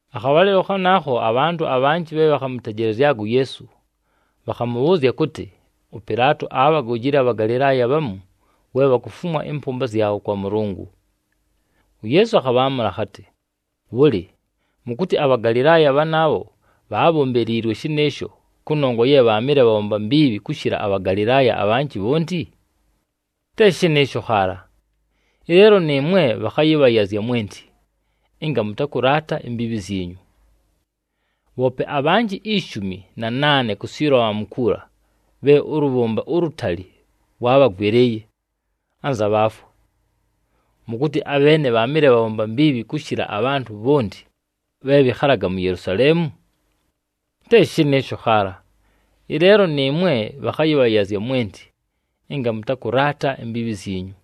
Akhabhalɨlo khanaakho, abhantʉ abhanjɨ bhe bhakhamʉtejelezyaga uYeesu, bhakhamʉbhʉʉzya kʉtɨ, ʉPɨlaato aabhagojile aBhagalɨlaaya bhamu, we bhakufumwa ɨmpʉmba zyabho kwa Mʉlʉngʉ. UYeesu akhabhaamʉla akhatɨ, “Bhʉlɨ, mʉkʉtɨ aBhagalɨlaaya bhanaabho bhaabhombeliilwe shɨnɨɨsho, kʉnongwa ye bhaamɨle bhabhomba mbiibhi kʉshɨla aBhagalɨlaaya abhanjɨ bhonti? Te shɨnɨɨsho khaala! Ɨleelo nɨɨmwe bhakhayɨbhayazya mwenti, ɨnga mʉtakʉlaata imbiibhi zyinyu! Bhoope abhanjɨ ishumi na naane ku Siloamu kuula, bhe ʉlʉbhʉmba ulutali lwaabhagwɨlɨɨye, anza bhaafwa. Mʉkʉtɨ abheene bhaamɨle bhabhomba mbiibhi kʉshɨla abhantʉ bhonti, bhe bhɨkhalaga mu Yelusaleemu? Te shɨnɨɨsho khaala! Ɨleelo nɨɨmwe bhakhayɨbhayazya mwenti, ɨnga mʉtakʉlaata imbiibhi zyinyu!”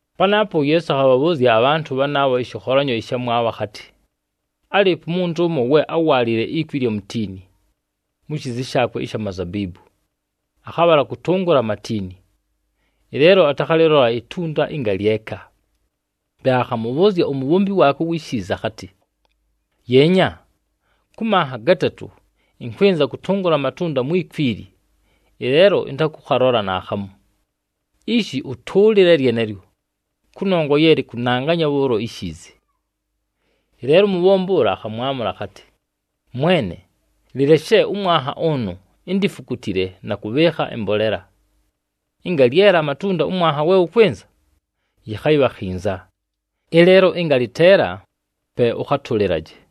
Panaapo uYeesu akhabhabhʉʉzya abhantʉ bhanaabho ɨshɨkholanyo ɨshamwabho akhatɨ, “Álɨɨpo umuntu ʉmo we áwaalile ikwi ɨlya mutiini, mu shiizi shaakwe ɨsha mazabiibu. Akhabhala kʉtʉngʉla amatiini, ɨleelo atakhalɨlola itunda ɨngalyeka. Pe akhamʉbhʉʉzya umubhombi waakwe uwi shiizi akhatɨ, ‘Yeenya! Kʉ manha gatatʉ ɨnkwɨnza kʉtʉngʉla amatunda mwi kwi ili, ɨleelo ɨntakʉkhalola naakhamu! Ishi ʉtʉʉlɨle lyenelyo, kʉnongwa ye lɨkʉnanganya bhʉʉlo ishiizi!’ “Ɨleelo umubhombi ʉla akhamwamʉla akhatɨ, ‘Mwene, lɨleshe ʉmwanha ʉnʉ, indifukutile na kʉbhɨɨkha ɨmbolela. Ɨnga lyela amatunda ʉmwanha we wʉkwɨnza, yɨkhayɨbha khinza! Ɨleelo ɨnga lɨteela, pe ʉkhatʉlɨlaje.’”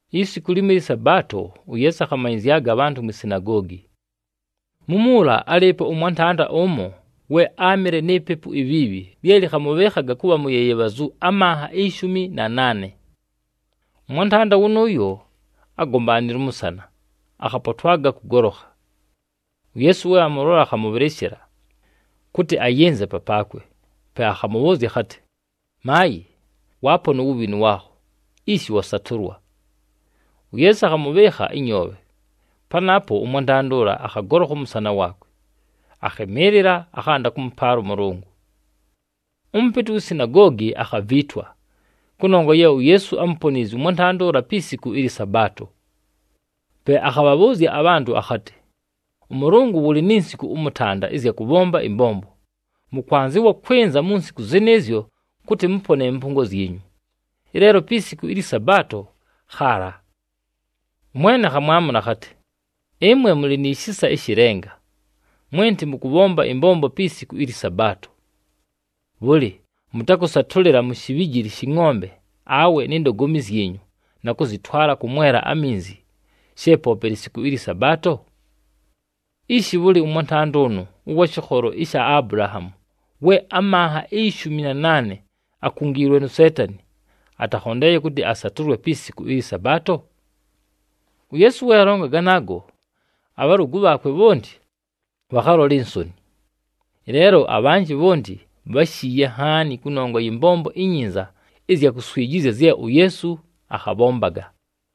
Isiku limo ɨlyɨ Sabaato, uYeesu akhamanyɨzyaga abhantʉ mwi sinagoogi. Mumuula, álɨɨpo ʉmwantanda ʉmo, we áamɨle ni pepu ibhiibhi lye lɨkhamʉbhɨɨkhaga kʉbha muyeyebhazu amanha ishumi na naane. Ʉmwantanda wʉnʉʉyo ágombaanile ʉmʉsana, akhapotwaga kʉgolokha. UYeesu we amʉlola, akhamʉbhɨlɨshɨla, kʉtɨ ayɨnze papaakwe. Pe akhamʉbhʉʉzya akhatɨ, “Maayɨ, waapona uwubhinu waakho, ishi wasatʉlwa!” UYeesu akhamʉbhɨɨkha ɨnyoobhe, panaapo ʉmwantanda ʉla, akhagolokha ʉmʉsana waakwe, akhɨmɨɨlɨla, akhanda kʉmʉpaala ʉMʉlʉngʉ. Ʉmʉpɨtɨ uwi sinagoogi akhaviitwa, kʉnongwa ye uYeesu ámuponiizye ʉmwantanda ʉla pi siku ɨlyɨ Sabaato. Pe akhabhabhʉʉzya abhantʉ akhatɨ, “Ʉmʉlʉngʉ wʉlɨ ni nsiku ʉmʉtanda ɨzya kʉbhomba ɨmbombo. Mʉkwanzɨwa kwɨnza mu nsiku zɨnɨɨzyo kʉtɨ mʉpone ɨmpʉngo zyinyu, ɨleelo pi siku ɨlyɨ Sabaato khaala!” ɄMwene akhamwamʉla akhatɨ, “Ɨmwe mʉlɨ ni shisa ɨshɨ lenga! Mwenti mʉkʉbhomba ɨmbombo pi siku ɨlyɨ Sabaato! Bhʉlɨ, mʉtakʉsatʉlɨla mu shibhijili shɨ ngʼombe awe ni ndogomi zyinyu, na kʉzɨtwala kʉmwela aminzi, she poope lisiku ɨlyɨ Sabaato? Ishi bhʉlɨ, ʉmwantanda ʉnʉ ʉwa shɨkholo sha Abulahaamu, we amanha ishumi na naane akungiilwe nu Seetani, atakhondeeye kʉtɨ asatʉlwe pi siku ɨlyɨ Sabaato?” UYeesu we alonga ganaago, abhalʉgʉ bhaakwe bhonti bhakhalola insoni. Ɨleelo abhanjɨ bhonti bháshiiye nhaani kʉnongwa yɨ mbombo inyinza ɨzya kuswijizya zye uYeesu akhabhombaga.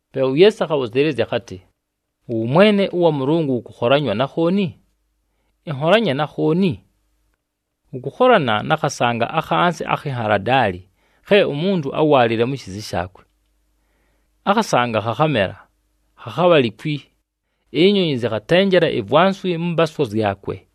Pe uYeesu akhabhʉzɨɨlɨzya akhatɨ, “Ʉwʉmwene wa Mʉlʉngʉ wʉkʉkholanywa na khooni? Ɨnholanye na khooni? Wʉkʉkholana na khasanga akhansi akhi nhaladaali khe umuntu áwaalile mu shiizi shaakwe. Akhasanga khakhamela, khakhabha likwi, inyonyi zɨkhatenjela ivwanswi mʉ mpaaswa zyakwe.”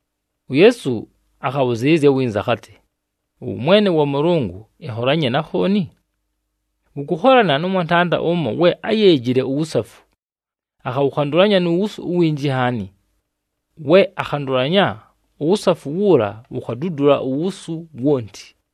UYeesu akhabhʉzɨɨlɨzya winza akhatɨ, “Ʉwʉmwene wa Mʉlʉngʉ, ɨnholanye na khooni? Wʉkʉkholana nʉ mwantanda ʉmo we áyeejile uwusafu, akhawʉkhandʉlanya nu wusu uwinji nhaani. We akhandʉlanya, uwusafu wuula wukhadudula uwusu wonti.”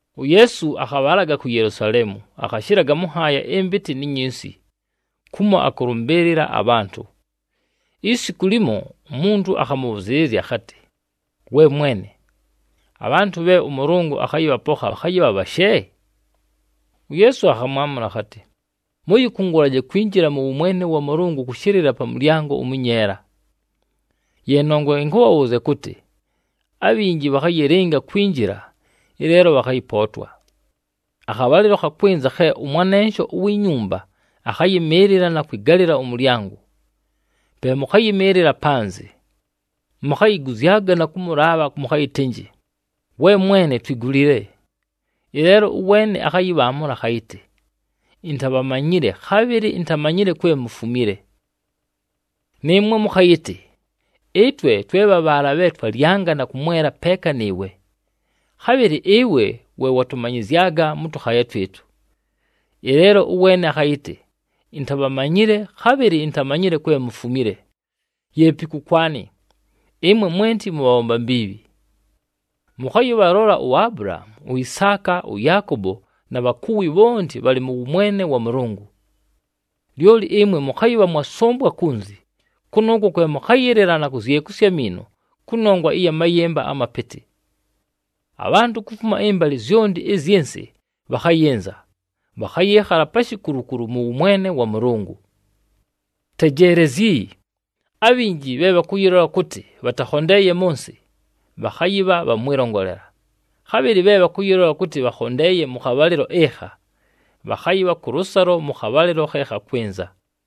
UYeesu akhabhalaga ku Yelusaleemu, akhashɨlaga mʉ nhaaya ɨmpɨtɨ ni nyinsi, kumo akʉlʉmbɨɨlɨla abhantʉ. Isiku limo, umuntu akhamʉbhʉzɨɨlɨzya akhatɨ, “We Mwene, abhantʉ bhe ʉMʉlʉngʉ akhayɨbhapokha bhakhayɨbha bhashe?” UYeesu akhamwamʉla akhatɨ, “Mʉyɨkʉngʉlaje kwinjila mʉ wʉmwene wa Mʉlʉngʉ kʉshɨlɨla pa mʉlyango ʉmʉnyeela. Ye nongwa ɨnkʉbhabhʉʉzya kʉtɨ, abhinji bhakhayɨlɨnga kwinjila, ɨleelo bhakhayɨpootwa. Akhabhalɨlo khakwɨnza khe ʉmwanensho uwi nyumba akhayɨmɨɨlɨla na kwɨgalɨla ʉmʉlyango. Pe mʉkhayɨmɨɨlɨla panzɨ, mukhayiguzyaga na kʉmʉlaabha mʉkhayɨtɨnjɨ, ‘We mwene, twigulile!’ Ɨleelo ʉweene akhayɨbhaamʉla akhayɨtɨ, ‘Intabhamanyile, khabhɨlɨ intamanyile kwe mufumile!’ “Nɨɨmwe mʉkhayɨtɨ, ‘Ɨtwe twe bha bhaala bhe twalyanga na kʉmwela peeka nɨɨwe! Khabhɨlɨ ɨwe we watʉmanyɨzyaga mʉ tʉkhaaya twɨtʉ!’ Ɨleelo ʉweene akhayɨtɨ, ‘Intabhamanyile, khabhɨlɨ intamanyile kwe mufumile! Yeepi kʉkwanɨ, ɨmwe mwenti mʉbhabhomba mbiibhi!’ “Mʉkhayɨbhalola uAbulahaamu, uIsaaka, ʉYaakobo, na bhakuwi bhonti bhalɨ mʉ wʉmwene wa Mʉlʉngʉ. Lyoli ɨmwe mʉkhayɨsʉmbwa kunzi. Kʉnʉʉkwo kwe mʉkhayɨlɨla na kuzyekusya amiino kʉnongwa ya mayɨmba amapɨtɨ! Abhantʉ kufuma ɨmbalɨ zyonti ɨzyɨ nsɨ bhakhayɨnza, bhakhayɨɨkhala pa shikulukulu mʉ wʉmwene wa Mʉlʉngʉ. “Tejeelezyi! Abhinji bhe bhakʉyɨlola kʉtɨ bhatakhondeeye mʉ nsɨ, bhakhayɨbha bha mwɨlongolela, khabhɨlɨ bhe bhakʉyɨlola kʉtɨ bhakhondeeye mʉ khabhalɨlo ɨkha, bhakhayɨbha kʉlʉsalo mʉ khabhalɨlo khe khakwɨnza.”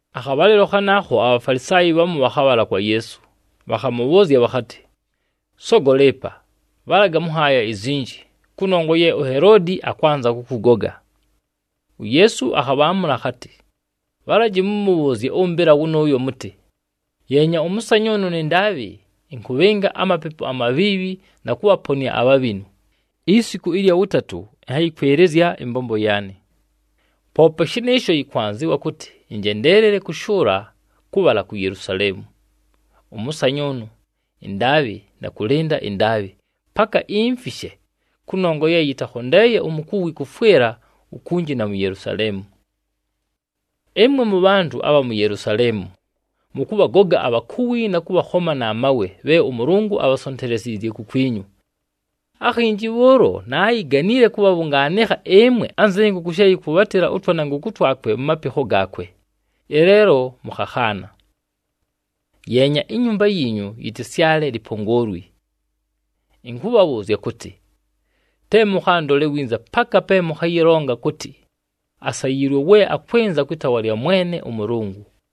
Akhabhalɨlo khanaakho, aBhafalisaayi bhamu bhakhabhala kwa Yeesu, bhakhamʉbhʉʉzya bhakhatɨ, “Sogola ɨpa, bhalaga mʉ nhaaya izinji, kʉnongwa ye uHeloodi akwanza kʉkʉgoga.” UYeesu akhabhaamʉla akhatɨ, “Bhalaji mʉmʉbhʉʉzye ʉmbɨla wʉnʉʉyo mʉtɨ, ‘Yeenya! Ʉmʉsanyʉʉnʉ nɨ ndaabhɨ, ɨnkʉbhɨnga amapepu amabhiibhi na kʉbhaponɨa abhabhinu, isiku ɨlya wʉtatʉ, ɨnhayɨkwɨlɨzya ɨmbombo yaanɨ. Poope shɨnɨɨsho, yɨkwanzɨwa kʉtɨ ɨnjendeelele kʉshʉʉla kʉbhala ku Yelusaleemu, ʉmʉsanyʉʉnʉ, ɨndaabhɨ, na kʉlɨnda ɨndaabhɨ, paka imfishe, kʉnongwa ye yɨtakhondeeye umukuwi kʉfwɨla ukunji na mu Yelusaleemu!’ “Ɨmwe mʉbhantʉ abha mu Yelusaleemu mʉkʉbhagoga abhakuwi na kʉbhakhoma na mawe bhe ʉMʉlʉngʉ abhasonteleziizye kukwinyu. Akhinji bhʉʉlo, naayiganile kʉbhabhʉngaanɨkha ɨmwe anzɨ nkʉkʉ she yɨkwʉbhatɨla ʉtwanankʉkʉ twakwe mu mapikho gaakwe, ɨleelo mʉkhakhaana! Yeenya, inyumba yiinyu yɨtɨsyale lipongoolwi! Ɨnkʉbhabhʉʉzya kʉtɨ, te mʉkhandole winza paka pe mʉkhayɨlonga kʉtɨ, ‘Asayiilwe we akwɨnza kwɨ taawa lya Mwene ʉMʉlʉngʉ!’”